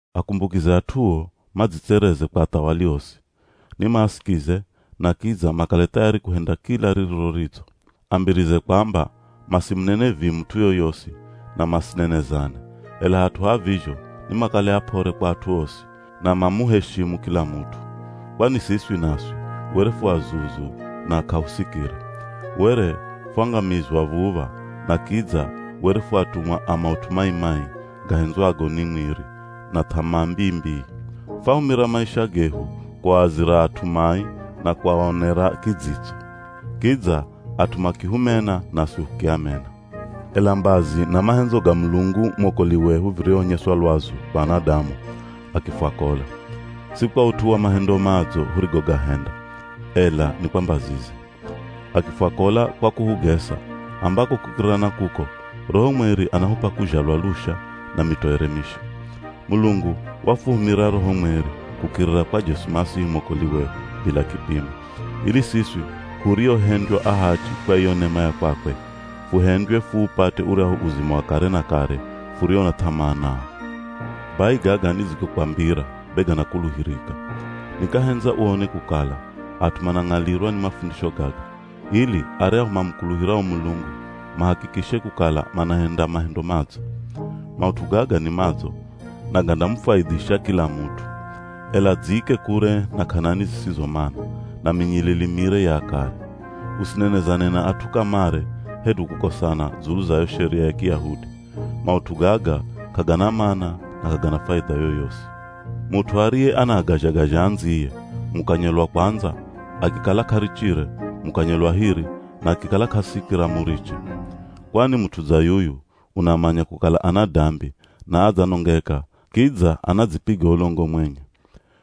Akumbukize at'uo madzitsereze kwa athawali osi. Nimaasikize, na kidza makale thayari kuhenda kila ririro ridzo. Ambirize kwamba masimunene vii mut'u yoyosi na masinenezane, ela hat'u ha vizho nimakale ap'ore kwa at'u osi, na mamuheshimu kila mut'u. Kwani siswi naswi were fu azuzu na k'ahusikira. Were fwangamizwa v̱uv̱a, na kidza were fu atumwa a maut'u mai-mai gahendzwago ni mwiri na th'amaa mbii-mbii. Fahumira maisha gehu kuaazira at'u mai na kuaonera kidzitso, kidza at'u makihumena naswi hukiamena. Ela mbazi na mahendzo ga Mulungu mwokoli wehu virihonyeswa lwazu kwa anadamu, akifwakola. Si kwa ut'u wa mahendo madzo hurigogahenda, ela ni kwa mbazize. Akifwakola kwa kuhugesa, ambako kukirira na kuko, Roho Mweri anahup'a kuzhalwa lusha na mitoere misha. Mulungu wafuhumira Roho Mweri kukirira kwa Jesu Masihi mwokoli wehu bila kipimo, ili siswi huriohendywa ahachi kwa iyo nema ya kwakwe, fuhendywe fuupate uryahu uzima wa kare na kare furio na th'amaa nao. Bai gaga nidzigokwambira be ganakuluhirika. Nikahendza uone kukala at'u manang'alirwa ni mafundisho gaga, ili aryahu mamukuluhirao Mulungu mahakikishe kukala manahenda mahendo madzo. Maut'u gaga ni madzo na gandamufwaidhisha kila mut'u. Ela dziike kure na k'anani zisizo mana, na minyilili mire ya akare. Usinenezane na at'u kamare hedu kukosana dzulu za yo Sheria ya Kiyahudi. Maut'u gaga k'agana mana na k'agana faidha yoyosi. Mut'u ariye anaagazha-gazha andziye, mukanye lwa kwandza, akikala k'arichire, mukanye lwa hiri na akikala k'asikira muriche. Kwani mut'u dza yuyu unamanya kukala ana dambi na adzanongeka kidza anadzipiga ulongo mwenye.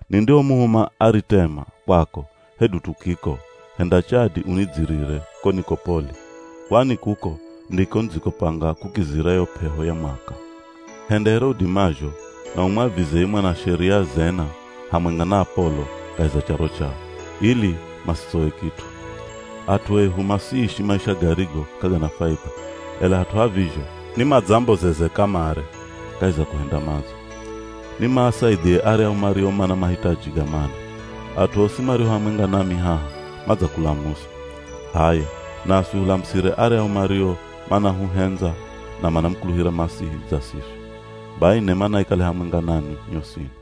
Nindihomuhuma Aritema kwako hedu Tukiko henda chadi unidzirire ko Nikopoli, kwani kuko ndiko nidzikopanga kukizira yo p'eho ya mwaka. Henda here udimazho na umwavize ye mwanasheria Zena hamwenga na Apolo kahi za charo chao, ili masitsowe kit'u. At'u ehu masiishi maisha garigo k'agana faidha, ela hat'u ha vizho ni madzambozeze kamare kahi za kuhenda madzo. Ni maasaidhie aryahu mario mana mahitaji ga mana. At'u osi mario hamwenga nami haha, madzakulamusa. H'aya, naswi hulamusire aryahu mario manahuhendza na manamukuluhira Masihi dza siswi. Bai nema naikale hamwenga nanwi nyosini.